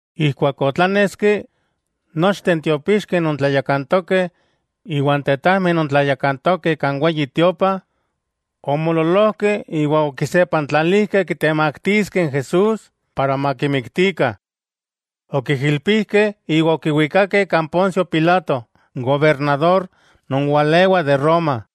Ijkuak otláneski, nochteh n tiopixkeh non tlayakantokeh iwa n tetajmeh non tlayakantokeh kan Weyi Tiopa, omoololojkeh iwa okisepantlalijkeh kitemaktiskeh n Jesús para makimiktikah. Okijilpijkeh iwa okiwikakeh kan Poncio Pilato n gobernador non walewa de Roma.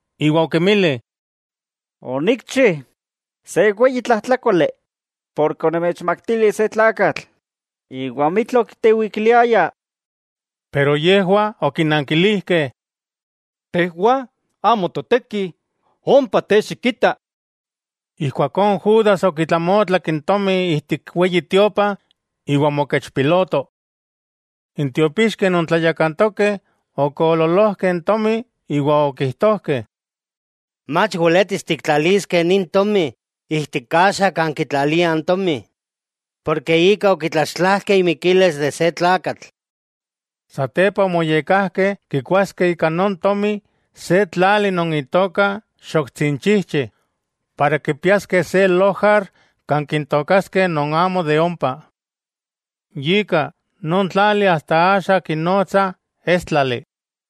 iwa okinmili: —Onikchi se weyi tlajtlákoli porke onomechmaktili se tlakatl iwa amitla okitewikiliaya. Pero yejwah okinankilijkeh: —¡Tejwah amo toteki! ¡Ompa te xikita! Ijkuakó Judas okitlamotlak n tomi ijtik n Weyi Tiopa, iwa omokechpiloto. N tiopixkeh non tlayakantokeh okoololojkeh n tomi iwa okijtojkeh: —Mach weletis tiktlaliskeh nin tomi ijtik kaxa kan kitlaliah n tomi, porke ika okitlaxtlajkeh imikilis se tlakatl. Satepa omoyekkajkeh kikoaskeh ika non tomi se tlali, non itoka Xoktsinchijchi para kipiaskeh se lojar kan kintookaskeh non amo de ompa. Yika, non tlali asta axa kinotsah Éstlali.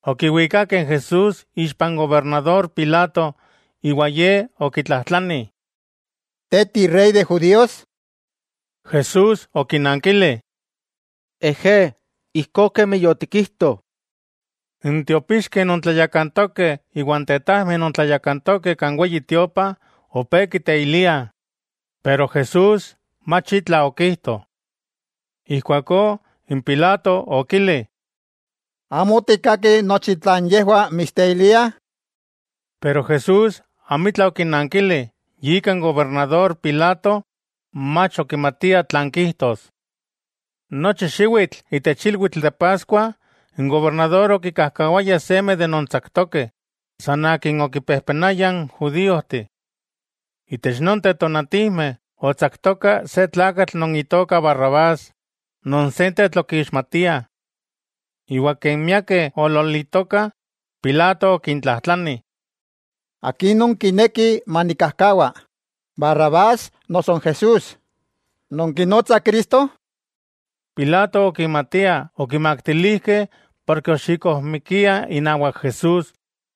Okiwikakeh n Jesús ixpa n gobernador Pilato, iwa ye okitlajtlani: —¿Te ti Rey de judíos? Jesús okinankili: —Ejé, ijkó kemi yotikijto. N tiopixkeh non tlayakantokeh iwa n tetajmeh non tlayakantokeh kan Weyi Tiopa opé kiteiliah, pero Jesús mach itla okijto. Ijkuakó n Pilato okili: —¿Amo tikkaki nochi tlan yejwah mitsteiliah? Pero Jesús amitla okinankili, yika n gobernador Pilato mach okimatia tlan kijtos. Nochi xiwitl itech ilwitl de Paskua n gobernador okikajkawaya seme de non tsaktokeh, san akin okipejpenayah n judíojteh. Itech nonteh tonatijmeh, otsaktoka se tlakatl non itoka Barrabás non sentetl okixmatiah. Iwa ken miakeh oolololitokah, Pilato okintlajtlani: —¿Akin nonkinekih manikkajkawa, Barrabás noso n Jesús, non kinotsah Cristo? Pilato okimatia okimaktilijkeh porke oxikojmikiah inawak Jesús.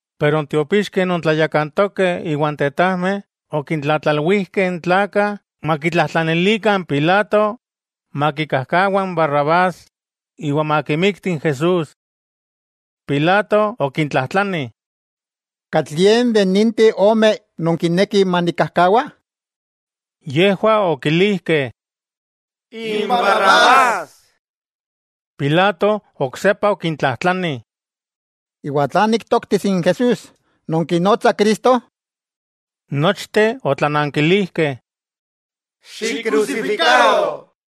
Pero n tiopixkeh non tlayakantokeh iwa n tetajmeh okintlatlalwijkeh n tlakah makitlajtlanilikah n Pilato, makikajkawa n Barrabás iwa makimikti n Jesús. Pilato okintlajtlani: —¿Katlie de ninteh omeh nonkinekih manikkajkawa? Yejwah okilijkeh: —¡N Barrabás! Pilato oksepa okintlajtlani: —¿Iwa tlan niktoktis n Jesús, non kinotsah Cristo? Nochteh otlanankilijkeh: —¡Xikkrusifikaro!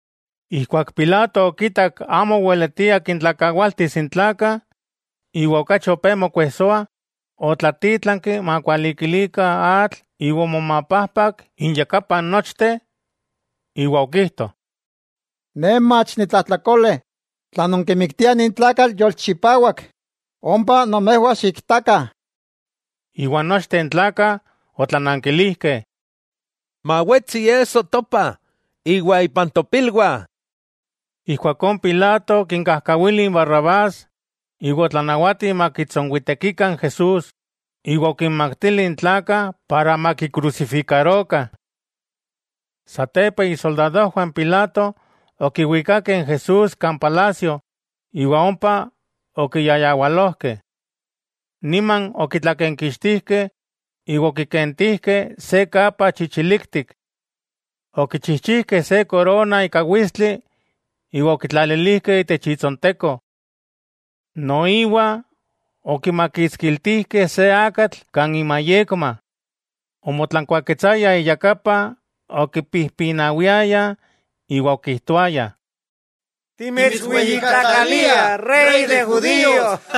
Ijkuak Pilato okitak amo oweletia kintlakawaltis n tlakah, iwa okachi opé mokuejsoah, otlatítlanki makualikilikah atl iwa omomapajpak inyakapah nochteh iwa okijto: —Ne mach nitlajtlakole tla nonkimiktiah nin tlakatl yolchipawak, ompa nomejwah xiktakah. Iwa nochteh n tlakah otlanankilijkeh: —¡Mawetsi iesso topah iwa ipan topilwah! Ijkuakó Pilato okinkajkawili n Barrabás, iwa otlanawati makitsonwitekikah n Jesús, iwa okinmaktili n tlakah para makikrusifikarokah. Satepa isoldadojwah n Pilato okiwikakeh n Jesús kan palasio, iwa ompa okiyayawalojkeh. Niman okitlakenkixtijkeh, iwa okikentilijkeh se kapa chichiliktik. Okichijchijkeh se korona ika witstli iwa okitlalilijkeh itech itsonteko. Noiwa okimakitskiltijkeh se akatl kan imayekma. Omotlankuaketsayah iyakapa, okipijpinawiayah, iwa okijtoayah: —¡Timitsweyijkatlaliah Rey de judíos!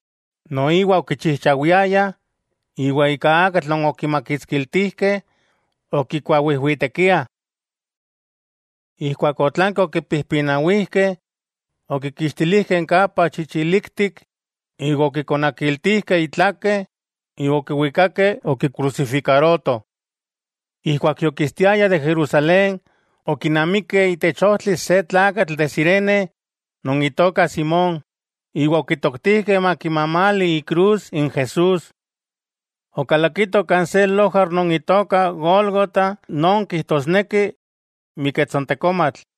Noiwa okichijchawiayah, iwa ika n akatl non okimakitskiltijkeh, okikuawijwitekiah. Ijkuak otlanki okipijpinawijkeh, okikixtilijkeh n kapa chichiliktik iwa okikonakiltijkeh itlake iwa okiwikakeh okikrusifikarotoh. Ijkuak yokistiayah de Jerusalén, okinamikeh itech ojtli se tlakatl de Cirene, non itoka Simón, iwa okitoktijkeh makimamali ikrus n Jesús. Okalakitoh kan se lojar non itoka Gólgota non kijtosneki: Miketsontekomatl.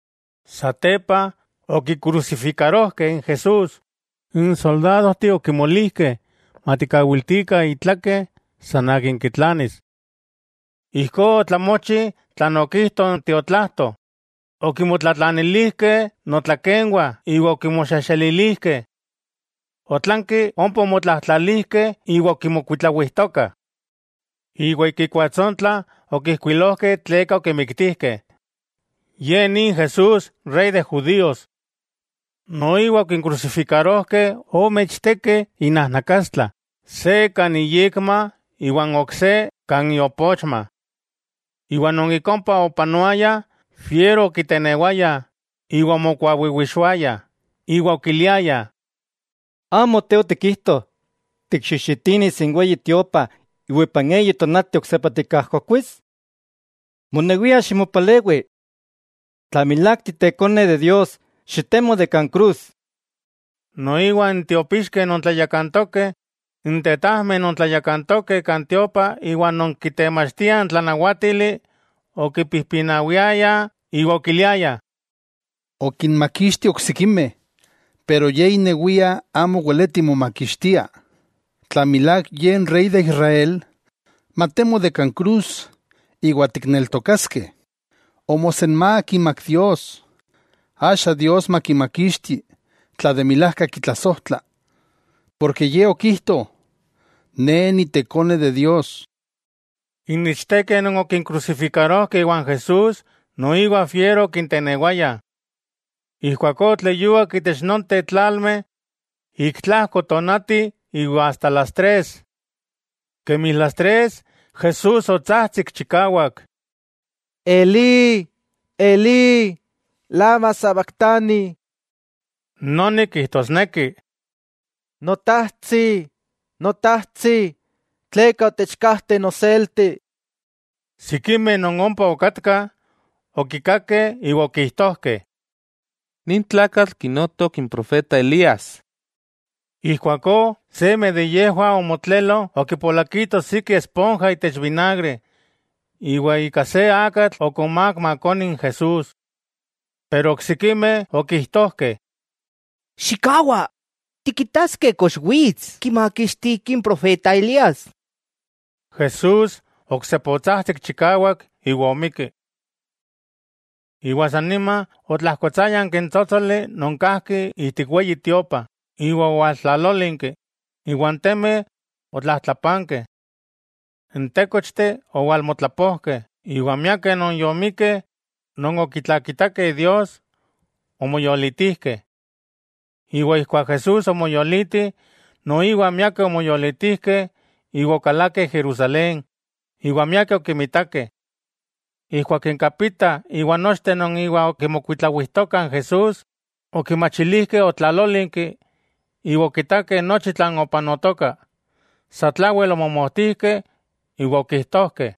Satepa, okikrusifikarojkeh n Jesús, n soldadojteh okimolijkeh matikawiltikah itlake, san akin kitlanis. Ijkó otlamochi tlan okijto n tiotlajto: okimotlatlanilijkeh notlakenwah iwa okinmoxexelilijkeh. Otlanki ompa omotlajtlalijkeh iwa okimokuitlawijtokah. Iwa ik ikuatsontla okijkuilojkeh tleka okimiktijkeh: “Ye ni n Jesús, Rey de Judíos.” Noiwa okinkrusifikarojkeh ome ichtekeh inajnakastla, se kan iyekma iwa n ok se kan iopochma. Iwa non ik ompa opanoayah fiero okitenewayah iwa omokuawiwixoayah, iwa okiliayah: —¿Amo te, otikijto tikxijxitinis n Weyi Tiopa, iwa ipan eyi tonati oksepa tikajkokuis? ¡Monewia ximopalewi! ¡Tla milák Te Ikone Dios, xitemo de kan krus! Noiwa n tiopixkeh non tlayakantokeh, n tetajmeh non tlayakantokeh kan tiopa iwa non kitemachtiah n tlanawátili, okipijpinawiayah iwa okiliayah: —Okinmakixti oksikimeh, pero Ye inewia amo weleti momakixtia. Tla milák Ye n Rey de Israel, matemo de kan krus iwa tikneltokaskeh. Omosenmák imak Dios, axa Dios makimakixti tla de milajka kitlasojtla, porke Ye okijto: “Ne Ikone Dios.” N ichtekeh non okinkrusifikarojkeh iwan Jesús noiwa fiero okitenewaya. Ijkuakó otleyuak itech nonteh tlalmeh, ik tlajko tonati iwa asta las tres. Kemi las tres Jesús otsajtsik chikawak: —Elí, Elí ¿lama sabaktani? —noni kijtosneki: Notajtsi, Notajtsi, ¿tleka otechkajte noselti? Sikimeh non ompa okatkah, okikakeh iwa okijtojkeh: —Nin tlakatl kinotok n profeta Elías. Ijkuakó seme de yejwah omotlelo okipolakito siki esponja itech vinagre, iwa ika se akatl okonmák makoni n Jesús. Pero oksikimeh okijtojkeh: —Xikkawa, tikitaskeh kox wits kimakixtiki n profeta Elías. Jesús oksepa otsajtsik chikawak, iwa omikki. Iwa sa nima otlajkotsáyanki n tsótsoli non kajki ijtik Weyi Tiopa iwa owaltlalólinki, iwa n temeh otlajtlapankeh. N tékochteh owalmotlapojkeh iwa miakeh non yomikkeh non okitlakitakeh Dios, omoyolitijkeh. Iwa ijkuak Jesús omoyoliti, noiwa miakeh omoyolitijkeh iwa okalakeh Jerusalén, iwa miakeh okimitakeh. Ijkuak n kapita iwa nochteh non iwa okimokuitlawijtokah n Jesús, okimachilijkeh otlalólinki iwa okitakeh nochi tlan opanotoka, sa tlawel omomojtijkeh iwa okijtojkeh: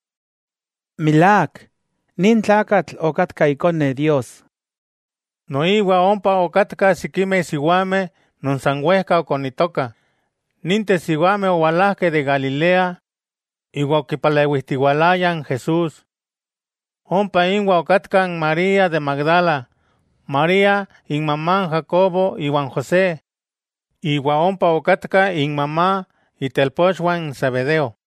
—¡Milák, nin tlakatl okatka Ikone Dios! Noiwa ompa okatkah sikimeh siwameh non san wejka okonitokah. Ninteh siwameh owalajkeh de Galilea iwa okipalewijtiwalayah n Jesús. Ompa inwah okatkah n María de Magdala, María inmamá n Jacobo iwa n José, noiwa ompa okatka inmamá itelpochwah n Zebedeo.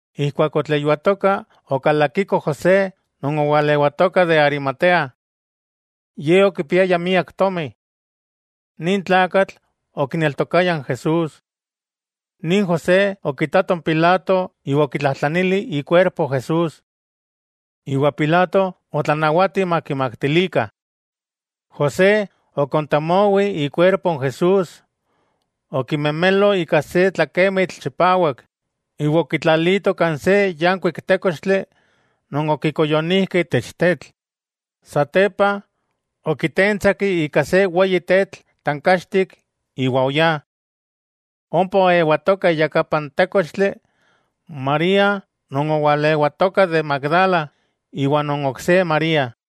Ijkuak yotleyuatoka, okalakiko José non owalewatoka de Arimatea. Ye okipiaya miak tomi. Nin tlakatl okineltokaya n Jesús. Nin José okitato n Pilato iwa okitlajtlanili ikuerpo Jesús. Iwa Pilato otlanawati makimaktilikah. José okontemowi ikuerpo n Jesús, okimemelo ika se tlakemitl chipawak iwa okitlalito kan se yankuik tékochtli non okikoyonijkeh itech tetl. Satepa, okitentsak ika se weyi tetl tankachtik iwa oyá. Ompa oewatokah iyakapa n tékochtli, María non owalewatoka de Magdala iwa non ok se María.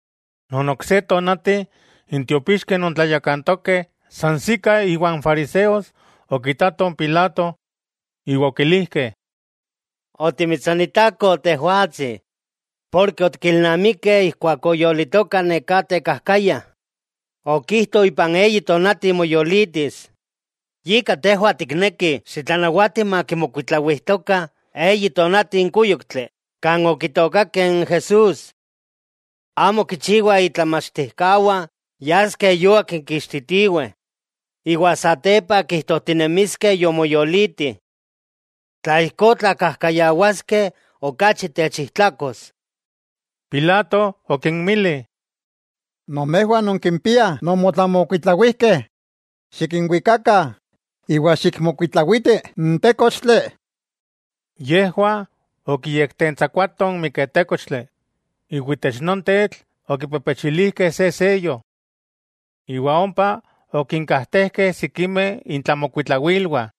Non ok se tonati, n tiopixkeh non tlayakantokeh sansikah iwa n fariseos, okitatoh n Pilato iwa okilijkeh: —Otimitsonitakoh tejwatsi, porke otikilnamikeh ijkuak oyolitoka neká tekajkaya, okijto ipan eyi tonati moyolitis. Yika tejwah tiknekih xitlanawati makimokuitlawijtokah eyi tonati n kúyoktli kan okitookakeh n Jesús. Amo kichiwa itlamachtijkawah yaskeh yuak kikixtitiweh, iwa satepa kijtojtinemiskeh yomoyoliti. Tla ijkó tlakajkayawaskeh okachi techijtlakos. Pilato okinmili: —Nomejwah nonkimpiah nomotlamokuitlawijkeh, xikinwikakah iwa xikmokuitlawitih n tékochtli. Yejwah okiyektentsakuatoh n miketékochtli, iwa itech non tetl okipepechilijkeh se seyo. Iwa ompa okinkajtejkeh sikimeh intlamokuitlawilwah.